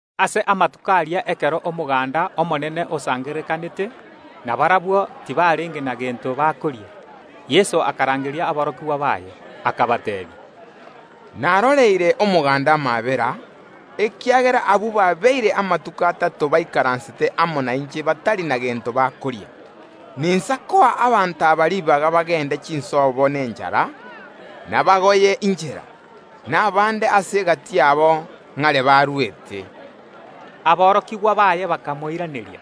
Ase amatuko aria ekero omoganda omonene osangererekanete, na barabwo tibarenge na gento bakoria, Yeso akarangeria aborokigwa baye, akabateebia, “Naroreire abanto aba amaabera, ekiagera barabwo babeire amatuko atato baikaransete amo nainche batari na gento bakoria; ninsa koa abanto aba ribaga bagende chinsobo n’enchara, nabagoye ’nchera, na abande ase egati yabo ng’are barwete.” Aborokigwa baye bakamoiraneria,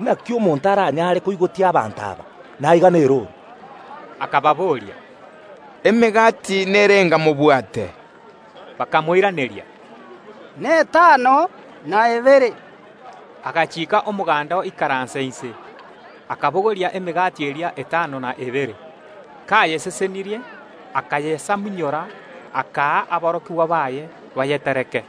“Inaki omonto aranyare koigotia abanto aba, na aiga nerooro?” Yeso akababoria, “Emegati nerenga mobwate?” Bakamoiraneria, “Netano na ebere.” Agachiika omoganda oikaranse inse, akabogoria emegati eria etano na ebere. Kayesesenirie, akayesamunyora, akaa aborokigwa baye bayebagere abanto,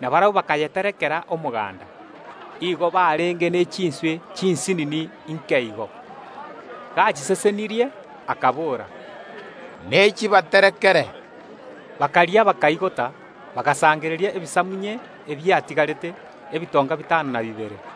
na barabwo bakayegagera omoganda. Igo barenge ne chinswe chinsinini nke igo. Gachisesenirie, akabora, “Nechi bagagere”! Bakaria, bakaigota; bagasangereria ebisamunye ebiatigarete, ebitonga bitano na bibere.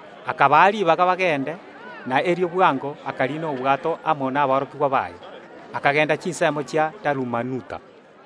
Akabaa ribaga bagende, na erio bwango akariina obwato amo naborokigwa baye, akagenda chinsemo chia Dalumanuta.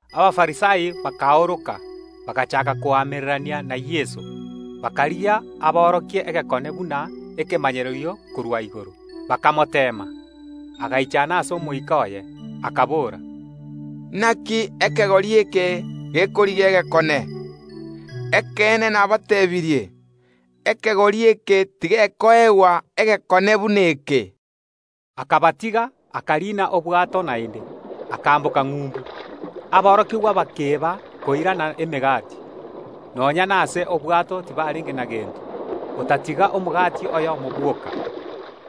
Abafarisai bakaoroka, bagachaaka koamererania na Yeso, bakarigia aborokie egekone buna ekemanyererio korwa igoro, bakomoteema. Agaichana ase omoika oye, akabora, “Inaki ekegori eke gekorigia egekone? Ekeene nabateebirie: Ekegori eke tigekoegwa egekone buna eke.” Akabatiga, akariina obwato naende, akamboka ng’umbu. Aborokigwa bakeeba koirana emegati; nonya nase obwato tibarenge na gento, otatiga omogati oyomo bwoka.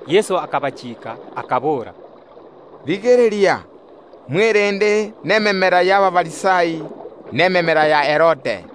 Yeso akabachiika, akabora, “Rigereria, mwerende nememera y’Abafarisai na ememera ya Herode.”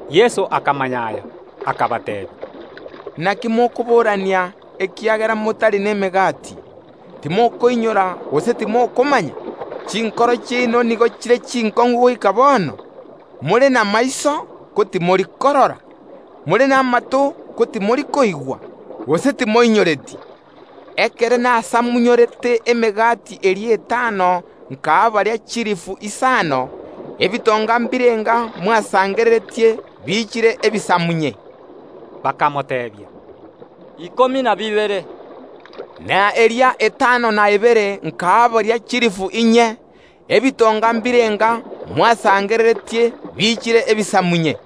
Yeso akamanya aya, akabateebia, “Inaki mokoborania, ekiagera motari nemegati? Timokoinyora gose timokomanya? Chinkoro chiaino nigo chire chinkong’u goika bono? ’More namaiso, ko timori korora? ’More namato, ko timori koigwa? Gose timoinyoreti? Ekero nasamunyorete emegati eria etano nkaa baria chilifu isano, ebitonga mbirenga mwasangererete biichire ebisamunye?” Bakamoteebia, “Ikomi na bibere.” “Na eria etano na ebere nkaa baria chilifu inye, ebitonga mbirenga mwasangereretie biichire ebisamunye?”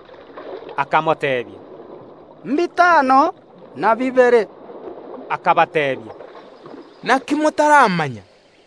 Bakamoteebia, “Mbitano na bibere.” Akabateebia, “Inaki motaramanya?”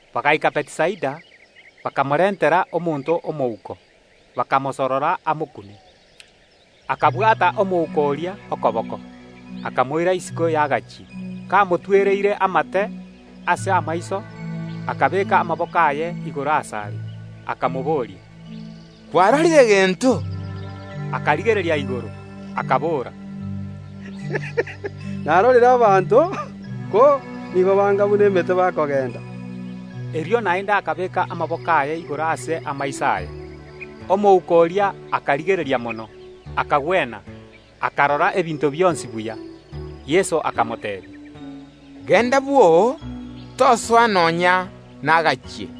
Bagaika Bethisaida. Bakarentera Yeso omonto omouko, bakamosorora amokune. Yeso akabwata omouko oria okoboko, akamoira isiko y’ekenyoro, Kamotwereire amate ase amaiso, akabeeka amaboko aye igoro asare, akamobooria, “Kwarorire gento?” Omouko oria akarigereria igoro, akabora, “Narorire abanto, ko nigo banga buna emete bakogenda.” Erio naende Yeso akabeeka amaboko aye igoro ase amaiso aye. Omouko oria akarigereria mono, akagwena, akarora ebinto bionsi buya. Yeso akamoteebia, “Genda bwoo, tosoa nonya nekenyoro!”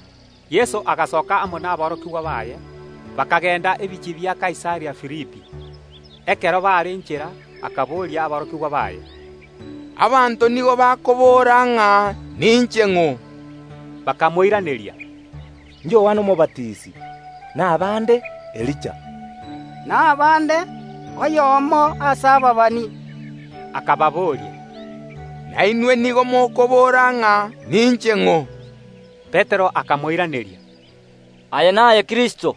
Yeso agasoka amo naborokigwa baye, bakagenda ebinyoro bia Kaisaria Filipi. Ekero baare nchera akaboria aborokigwa baye, “Abanto nigo bakobora ng’a ninche ning’o?” Bakamoiraneria, “Yohana Omobatisi; na abande: Elija; na abande: Oyomo ase ababani.” Akababoria, “Nainwe nigo mokobora ng’a ninche ng’o?” Petero akamoiraneria, “Aye naye Kristo.”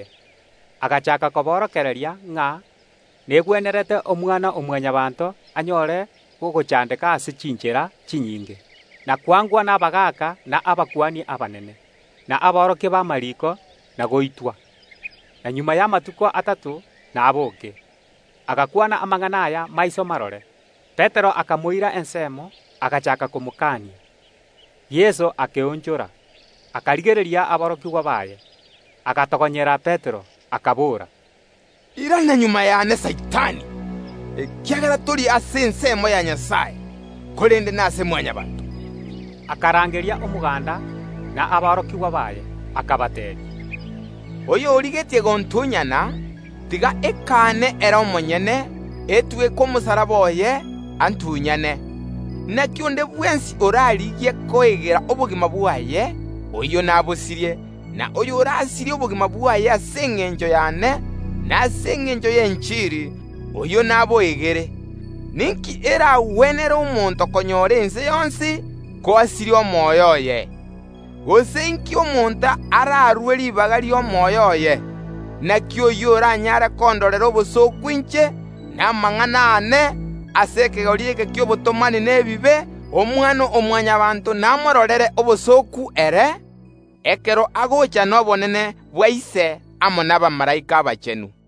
Erio Yeso agachaaka koborokereria, ng’a negwenerete Omwana-o-Mwanyabaanto anyore ogochandeka ase chinchera chinyinge, na kwangwa nabagaaka na abakuani abanene, na aborokia b’amariiko, na goitwa, na magega y’amatuko atato nabooke. Agakwana amang’ana aya maiso marore. Petero akamoira ensemo, agachaaka komokania. Yeso akeonchora, akarigereria aborokigwa baye, agatogonyera Petero, akabora, “Irana magega y’ane Saitani, ekiagera tori ase ensemo ya Nyasae, korende nase Mwanyabaanto.” Erio Yeso akarangeria omoganda na aborokigwa baye, akabateebia, “Oyorigetie gontunyana, tiga ekaane ere omonyene, etweke omosalaba oye, antunyane. Inaki onde bwensi orarigie koegera obogima bwaye, oyio nabosirie; na oyorasirie obogima bwaye ase engencho y’ane, na ase engencho y’enchiri, oyio naboegere. Ninki eragwenere omonto konyora ense yonsi, ko asirie omoyo oye? Gose inki omonto ararue ribaga ri’omoyo oye? Inaki oyio oranyare kondorera obosooku inche, na amang’ana aane, ase ekegori eke ki’obotomani na ebibe, Omwana-o-Mwanyabaanto namororere obosooku ere, ekero agocha n’obonene bwa Ise amo nabamalaika abachenu.”